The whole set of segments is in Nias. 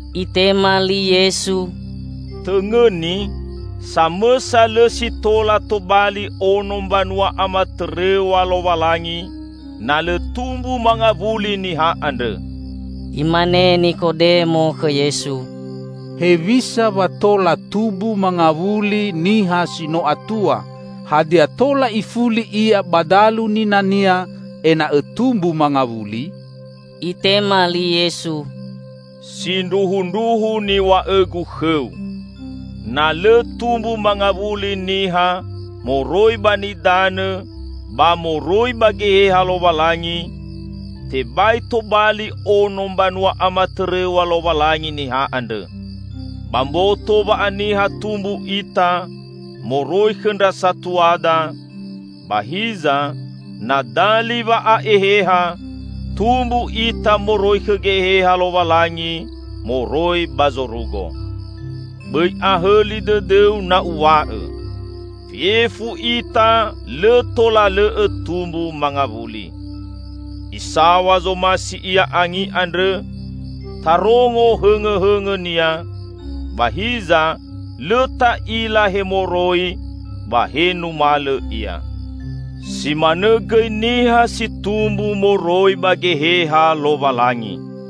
Itema li Yesu, "Tõngõni: samõsa lõ si tola tobali ono mbanua amatõrõw̃a Lowalangi, na lõ tumbu mangawuli niha andrõ." Imane Nikodemo khõ Yesu, "Hewisa wa tola tumbu mangawuli niha si no atua, hadia tola ifuli ia ba dalu ninania ena'õ tumbu mangawuli?" Itema li Yesu, "Sindruhundruhu niw̃a'õ-Gu khõu: Na lõ tumbu mangawuli niha moroi ba nidanõ ba moroi ba Geheha Lowalangi, tebai tobali ono mbanua amatõrõw̃a Lowalangi niha andrõ. Ba mboto wa'aniha tumbu ita moroi khõ ndra satuada, ba hiza na dali wa'a'eheha, tumbu ita moroi khõ Geheha Lowalangi moroi ba zorugo. Bõi ahõli dõdõu na Uw̃a'õ: fefu ita lõ tola lõ'õ tumbu mangawuli. Isaw̃a zomasi ia angi andrõ; tarongo hõngõhõngõnia, ba hiza lõ ta'ila he moroi ba he numalõ ia. Si manõ gõi niha si tumbu moroi ba Geheha Lowalangi."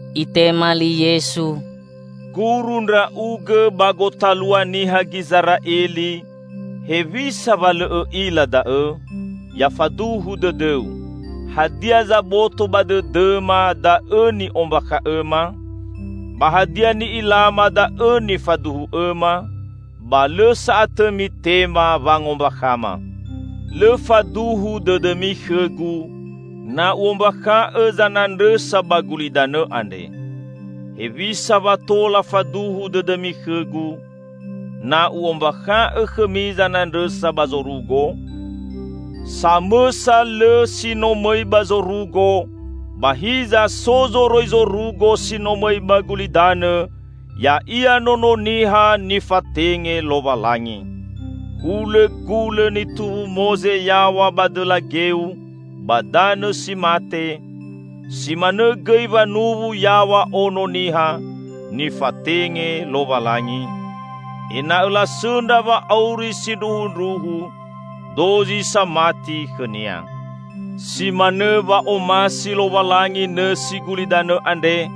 Itema li Yesu, "Guru ndra'ugõ ba gotalua niha Gizera'eli, hewisa wa lõ õ'ila da'õ? Ya faduhu dõdõu: hadia zaboto ba dõdõma da'õ ni'ombakha'õma, ba hadia ni'ilama da'õ nifaduhu'õma, ba lõ sa'atõ mitema wangombakhama. Lõ faduhu dõdõmi khõ-Gu, na U'ombakha'õ zanandrõsa ba gulidanõ andre; hewisa wa tola faduhu dõdõmi khõ-Gu, na U'ombakha'õ khõmi zanandrõsa ba zorugo? Samõsa lõ si no mõi ba zorugo, ba hiza so zoroi zorugo si no mõi ba gulidanõ, ya'ia Nono Niha nifatenge Lowalangi. Hulõ gulõ nituwu Moze yaw̃a ba dõla geu ba danõ si mate, si manõ gõi wanuwu yaw̃a Ono Niha nifatenge Lowalangi, ena'õ lasõndra wa'auri sindruhundruhu dozi samati khõ-Nia." Si manõ wa'omasi Lowalangi nõsi gulidanõ andre,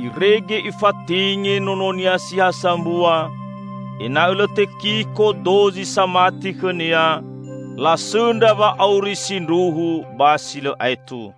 irege Ifatenge nono-Nia si ha sambua, ena'õ lõ tekiko dozi samati khõ-Nia, lasõndra wa'auri sindruhu ba si lõ aetu.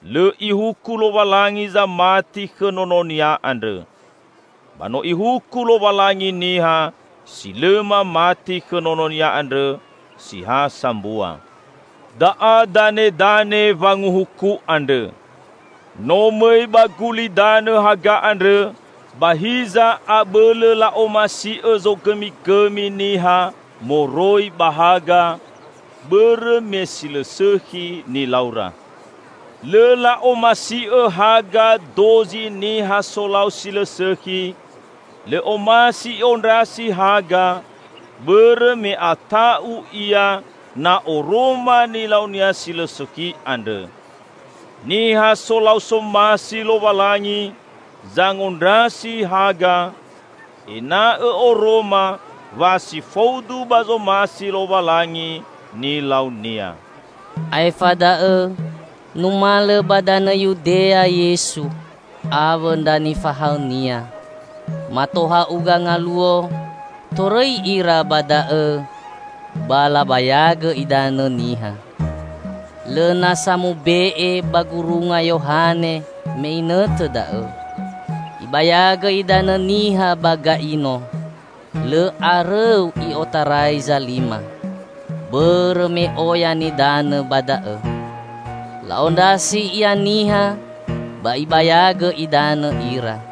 Lõ Ihuku Lowalangi zamati khõ nono-Nia andrõ. Ba no Ihuku Lowalangi niha si lõ mamati khõ Nono-Nia andrõ si ha sambua. Da'a danedane wanguhuku andrõ: No mõi ba gulidanõ haga andrõ, ba hiza abõlõ la'omasi'õ zogõmigõmi niha moroi ba haga, bõrõ me si lõ sõkhi nilaura. Lõ la'omasi'õ haga dozi niha solau si lõ sõkhi; lõ omasi i'ondrasi haga, bõrõ me ata'u ia na oroma nilaunia si lõ sõkhi andrõ. Niha solau somasi Lowalangi, zangondrasi haga; ena'õ oroma wa si faudu ba zomasi Lowalangi nilaunia. Aefa da'õ numalõ ba danõ Yudea Yesu awõ ndra nifahaõ-Nia. Mato ha'uga ngaluo torõi ira ba da'õ ba labayagõ idanõ niha. Lõ nasa mube'e ba gurunga Yohane me inõtõ da'õ. Ibayagõ idanõ niha ba Gaino, lõ arõu i'otarai Zalima, bõrõ me oya nidanõ ba da'õ. La'ondrasi ia niha, ba ibayagõ idanõ ira.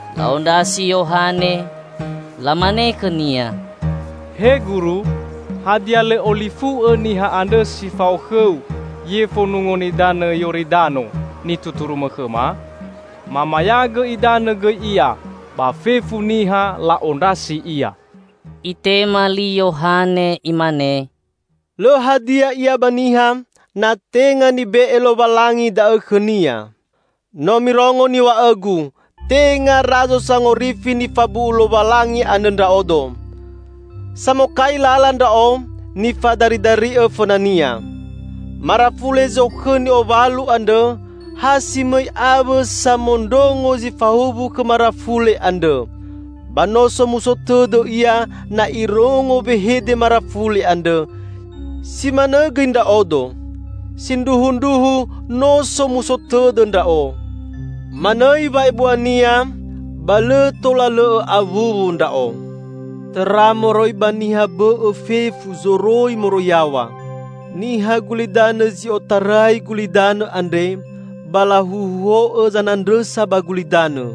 La'ondrasi Yohane, lamane khõnia, "He Guru, hadia lõ olifu'õ niha andrõ si fao khõu yefo Nungo Nidanõ Yoridano, nituturumõ khõma? Mamayagõ idanõ gõi Ia, ba fefu niha la'ondrasi Ia!" Itema li Yohane, imane, "Lõ hadia ia ba niha, na tenga nibe'e Lowalangi da'õ khõnia. No mirongo niw̃a'õgu, 'Tenga Razo Sangorifi nifabu'u Lowalangi andrõ ndra'odo. Samokai lala ndra'o nifadaridari'õ fõna-Nia.' Marafule zokhõ ni'owalu andrõ. Ha si mõi awõ samondrongo zi fahuwu khõ marafule andrõ, ba no somuso tõdõ ia na irongo wehede marafule andrõ. Si manõ gõi ndra'odo. Sindruhundruhu no somuso tõdõ ndra'o. Manõi wa'ebua-Nia ba lõ tola lõ'õ awuwu ndra'o." Tõra moroi ba niha bõ'õ fefu zoroi moroi yaw̃a. Niha gulidanõ zi otarai gulidanõ andre, ba lahuhuo'õ zanandrõsa ba gulidanõ.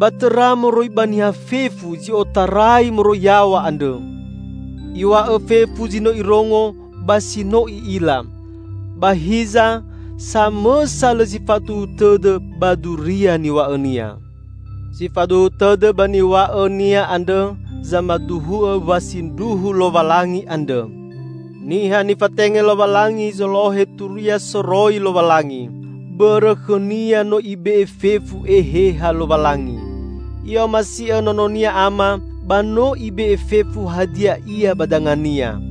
Ba tõra moroi ba niha fefu zi otarai moroi yaw̃a andrõ! Iw̃a'õ fefu zi no Irongo ba si no I'ila, ba hiza samõsa lõ si faduhu tõdõ ba duria niw̃a'õ-Nia. Si faduhu tõdõ ba niw̃a'õ-Nia andrõ zamaduhu'õ wa sindruhu Lowalangi andrõ. Niha nifatenge Lowalangi zolohe Turia soroi Lowalangi, bõrõ khõ-Nia no Ibe'e fefu Eheha Lowalangi. I'omasi'õ Nono-Nia Ama, ba no Ibe'e fefu hadia ia ba danga-Nia.